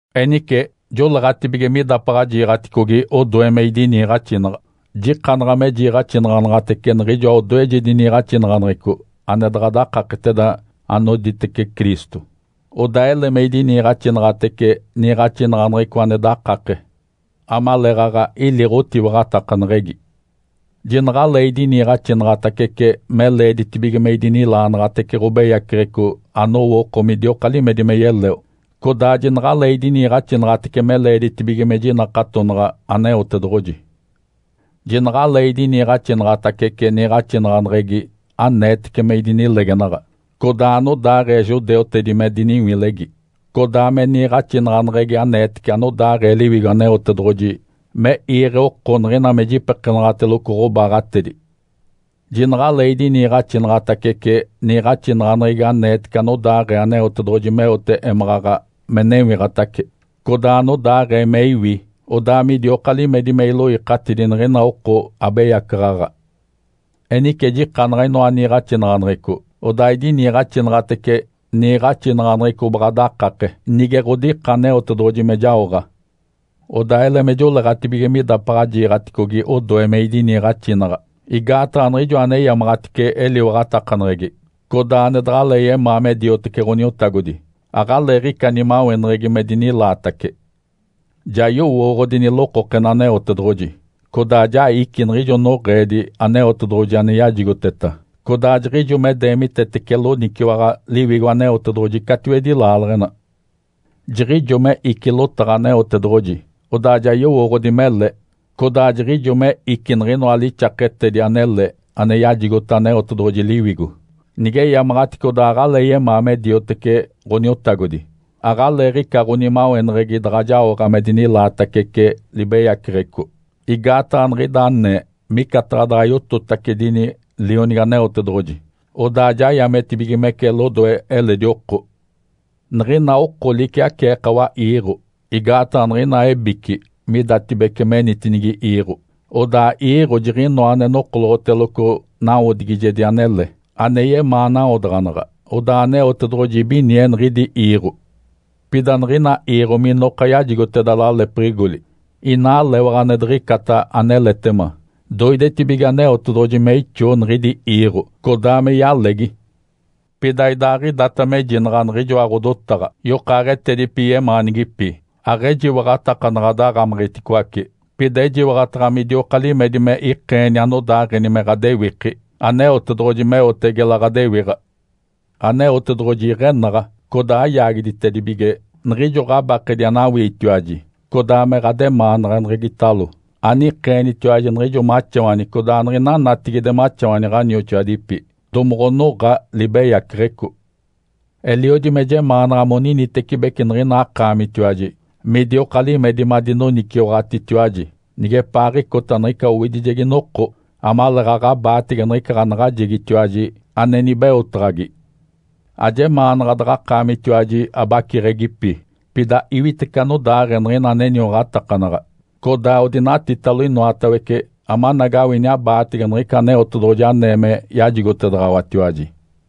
Enice joleeɡ̶atibige midapaɡ̶a jiiɡ̶aticogi odoe me idiniiɡ̶axinaɡ̶a. Jikanaɡ̶a me jiiɡ̶axinaɡ̶anaɡ̶atece niɡ̶ijoa odoejedi niiɡ̶axinaɡ̶aneɡ̶eco ane daɡ̶a dakaketeda anoditece Cristo. Odaa ele me idiniiɡ̶axinaɡ̶atece niiɡ̶axinaɡ̶aneɡ̶eco ane dakake, amaleeɡ̶aɡ̶a ili ɡ̶otiwaɡ̶atakaneɡ̶egi. Jinaɡ̶alee idiniiɡ̶axinaɡ̶atacece me leeditibige me idinilaanaɡ̶atece ɡ̶obeyaceɡ̶eco anowo oko midioka limedi me yeleo, codaa jinaɡ̶alee idiniiɡ̶axinaɡ̶atece me leeditibige me jinakatonaɡ̶a Aneotedoɡ̶oji. Jinaɡ̶alee idiniiɡ̶axinaɡ̶atacece niiɡ̶axinaɡ̶aneɡ̶egi aneetece me idinilegenaɡ̶a, codaa anodaaɡ̶ee judeutedi me diniwilegi, codaa me niiɡ̶axinaɡ̶aneɡ̶egi aneetece anodaaɡ̶ee Liwigo Aneotedoɡ̶oji me iiɡ̶e oko niɡ̶ina me jipekenaɡ̶ateloco ɡ̶obaaɡ̶atedi. Jinaɡ̶alee idiniiɡ̶axinaɡ̶atacece niiɡ̶axinaɡ̶aneɡ̶egi aneetece anodaaɡ̶ee Aneotedoɡ̶oji meote émaɡ̶aɡ̶a me newiɡ̶atace, codaa anodaaɡ̶ee me iwi, odaa midioka limedi me iloikatidi niɡ̶ina oko abeyacaɡ̶aɡ̶a. Enice jikanaɡ̶a inoa niiɡ̶axinaɡ̶aneɡ̶eco, odaa idiniiɡ̶axinaɡ̶atece niiɡ̶axinaɡ̶aneɡ̶eco baɡ̶a dakake, nige ɡ̶odika Aneotedoɡ̶oji me jaoɡ̶a. Odaa ele me joleeɡ̶atibige midapaɡ̶a jiiɡ̶aticogi odoe me idiniiɡ̶axinaɡ̶a, igaataɡ̶a niɡ̶ijo aneyamaɡ̶atice eliwaɡ̶atakaneɡ̶egi, codaa ane daɡ̶alee yemaa me diotece Ǥoniotagodi, aɡ̶aleeɡ̶ica nimaweneɡ̶egi me dinilaatace. Ja yowooɡ̶odi nilokokena Aneotedoɡ̶oji, codaa ja ici niɡ̶ijo noɡ̶eedi Aneotedoɡ̶oji ane yajigoteta, codaa jiɡ̶ijo me deemitetece loniciwaɡ̶a Liwigo Aneotedoɡ̶oji catiwedi laaleɡ̶ena. Jiɡ̶ijo me ici lotaɡ̶a Aneotedoɡ̶oji, odaa ja yowooɡ̶odi mele, codaa jiɡ̶ijo me ici niɡ̶inoa lixaketedi anele ane yajigota Aneotedoɡ̶oji Liwigo, nigeyamaɡ̶atice odaa aɡ̶alee yemaa me diotece Ǥoniotagodi, aɡ̶aleeɡ̶ica ɡ̶onimaweneɡ̶egi daɡ̶a jaoɡ̶a me dinilaatacece libeyaceɡ̶eco, igaataɡ̶a niɡ̶ida anee micataɡ̶a daɡ̶a yototacedini Lionigi Aneotedoɡ̶oji, odaa ja yametibigimece lodoe eledi oko. Niɡ̶ina oko liciaceekawa iiɡ̶o. Igaataɡ̶a niɡ̶ina ebici midatibece menitinigi iiɡ̶o, odaa iiɡ̶o jiɡ̶inoa ane nokoloɡ̶oteloco nawodigijedi anele, ane yemaa nawodaɡ̶anaɡ̶a, odaa Aneotedoɡ̶oji ibinie niɡ̶idi iiɡ̶o. Pida niɡ̶ina iiɡ̶o minoka yajigoteda lalepiɡ̶igoli inaa lewaɡ̶a ane diɡ̶icata aneletema, doidetibige Aneotedoɡ̶oji me ixoo niɡ̶idi iiɡ̶o, codaa me yalegi. Pida idaaɡ̶idata mejinaɡ̶a niɡ̶ijoa ɡ̶odotaɡ̶a, yokaaɡ̶etedipi yemaanigipi, aɡ̶ejiwaɡ̶atakanaɡ̶a daɡ̶amiɡ̶iticoace, pida ejiwaɡ̶ataɡ̶a midioka limedi me ikeeni anodaaɡ̶eni me ɡ̶adewiki Aneotedoɡ̶oji meote gela ɡ̶adewiɡ̶a. Aneotedoɡ̶oji iɡ̶enaɡ̶a, codaa ayaagiditedibige niɡ̶ijo ɡ̶abakedi anawiitiwaji, codaa me ɡ̶ademaanaɡ̶aneɡ̶egitalo anikeenitiwaji niɡ̶ijo maxawani codaa niɡ̶ina natigide maxawani ɡ̶anioxoadipi, domoɡ̶onoɡ̶a libeyaceɡ̶eco. Eliodi me jemaanaɡ̶a moninitecibeci niɡ̶ina akaamitiwaji midioka limedi madinoniciwaɡ̶atitiwaji nigepaaɡ̶icota niɡ̶ica owidijegi noko, amaleeɡ̶aɡ̶a abaatege niɡ̶ica ɡ̶anaɡ̶ajegitiwaji ane nibeotaɡ̶agi. Ajemaanaɡ̶a daɡ̶akaamitiwaji abaciɡ̶egipi, pida iwitece anodaaɡ̶ee niɡ̶ina aneniwaɡ̶atakanaɡ̶a, codaa odinatitalo inoatawece, amanagawini abaatege niɡ̶ica Aneotedoɡ̶oji anee me yajigotedaɡ̶awatiwaji.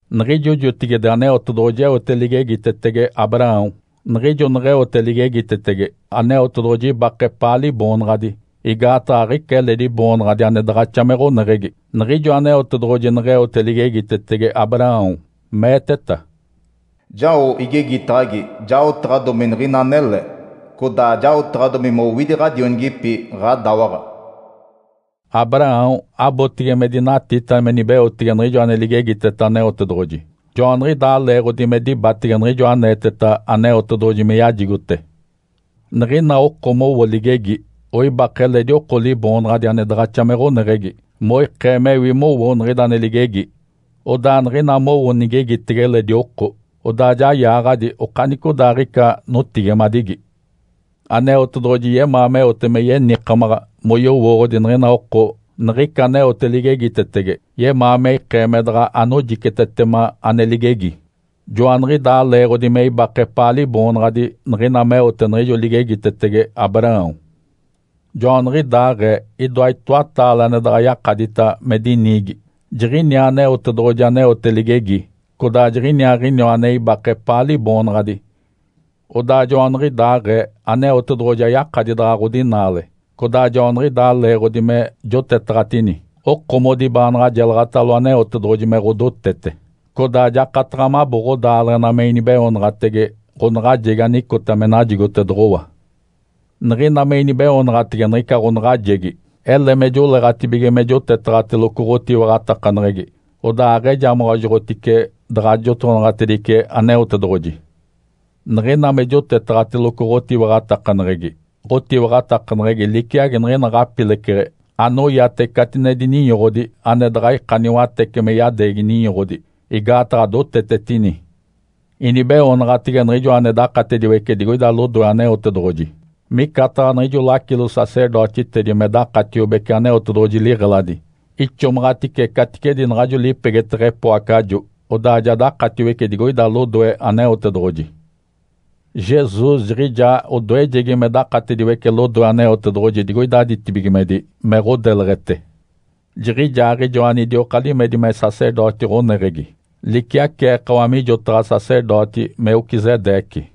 Niɡ̶ijo jotigide Aneotedoɡ̶oji eote ligegitetege Abraão. Niɡ̶ijo neɡ̶eote ligegitetege, Aneotedoɡ̶oji ibake epaa Liboonaɡ̶adi, igaataɡ̶a aɡ̶ica eledi boonaɡ̶adi ane daɡ̶axa me ɡ̶oneɡ̶egi. Niɡ̶ijo Aneotedoɡ̶oji neɡ̶eote ligegitetege Abraão, meeteta, “Jao igegitaɡ̶agi jaotaɡ̶adomi niɡ̶ina anele, codaa jaotaɡ̶adomi mowidi ɡ̶adionigipi, ɡ̶adawaɡ̶a.” Abraão abotege me dinatita me nibeotege niɡ̶ijo ane ligegiteta Aneotedoɡ̶oji, joaniɡ̶idaa leeɡ̶odi me dibatege niɡ̶ijo aneeteta Aneotedoɡ̶oji me yajigote. Niɡ̶ina oko mowo ligegi, oibake eledi oko liboonaɡ̶adi ane daɡ̶axa me ɡ̶oneɡ̶egi moikee mewi mowo niɡ̶ida ane ligegi. Odaa niɡ̶ina mowo nigegitege eledi oko, odaa ja yaaɡ̶adi okanicodaaɡ̶ica notigimadigi. Aneotedoɡ̶oji yemaa meote me yenikamaɡ̶a moyowooɡ̶odi niɡ̶ina oko niɡ̶ica aneote ligegitetege. Yemaa me ikee me daɡ̶a anojicetetema ane ligegi. Joaniɡ̶idaa leeɡ̶odi me ibake epaa Liboonaɡ̶adi niɡ̶ina meote niɡ̶ijo ligegitetege Abraão. Joaniɡ̶idaaɡ̶ee idoa itoataale ane daɡ̶a yakadita me diniigi: Jiɡ̶iniaa Aneotedoɡ̶oji aneote ligegi, codaa jiɡ̶iniaaɡ̶iniwa ane ibake epaa Liboonaɡ̶adi. Odaa joaniɡ̶idaaɡ̶ee Aneotedoɡ̶oji ayakadi daɡ̶a ɡ̶odinaale. Codaa joaniɡ̶idaa leeɡ̶odi me jotetaɡ̶atini, okomodi baanaɡ̶a jelaɡ̶atalo Aneotedoɡ̶oji me ɡ̶odotete, codaa jakataɡ̶a mabo ɡ̶odaaleɡ̶ena me inibeoonaɡ̶atege ɡ̶onaɡ̶ajegi anicota me najigotedoɡ̶owa. Niɡ̶ina me inibeoonaɡ̶atege niɡ̶ica ɡ̶onaɡ̶ajegi, ele me joleeɡ̶atibige me jotetaɡ̶ateloco ɡ̶otiwaɡ̶atakaneɡ̶egi, odaa aɡ̶ejamaɡ̶ajoɡ̶otice daɡ̶a jotonaɡ̶atedice Aneotedoɡ̶oji. Niɡ̶ina me jotetaɡ̶ateloco ɡ̶otiwaɡ̶atakaneɡ̶egi, ɡ̶otiwaɡ̶atakaneɡ̶egi liciagi niɡ̶ina ɡ̶apileceɡ̶e anoyate catinedi ninyoɡ̶odi ane daɡ̶a ika niwatece me yadeegi ninyoɡ̶odi, igaataɡ̶a dotetetini. Inibeoonaɡ̶atege Niɡ̶ijoa ane dakatediwece digoida lodoe Aneotedoɡ̶oji, micataɡ̶a niɡ̶ijo lacilo-sacerdotitedi me dakatiobece Aneotedoɡ̶oji liɡ̶eladi, ixomaɡ̶atice caticedi naɡ̶ajo lipegeteɡ̶e epoacajo, odaa ja dakatiwece digoida lodoe Aneotedoɡ̶oji. Jesus jiɡ̶ijaa odoejegi me dakatediwece lodoe Aneotedoɡ̶oji digoida ditibigimedi me ɡ̶odeleɡ̶ete. Jiɡ̶ijaaɡ̶ijoa anidioka limedi me sacerdoti ɡ̶oneɡ̶egi, liciaceekawa mijotaɡ̶a sacerdoti Melquisedeque.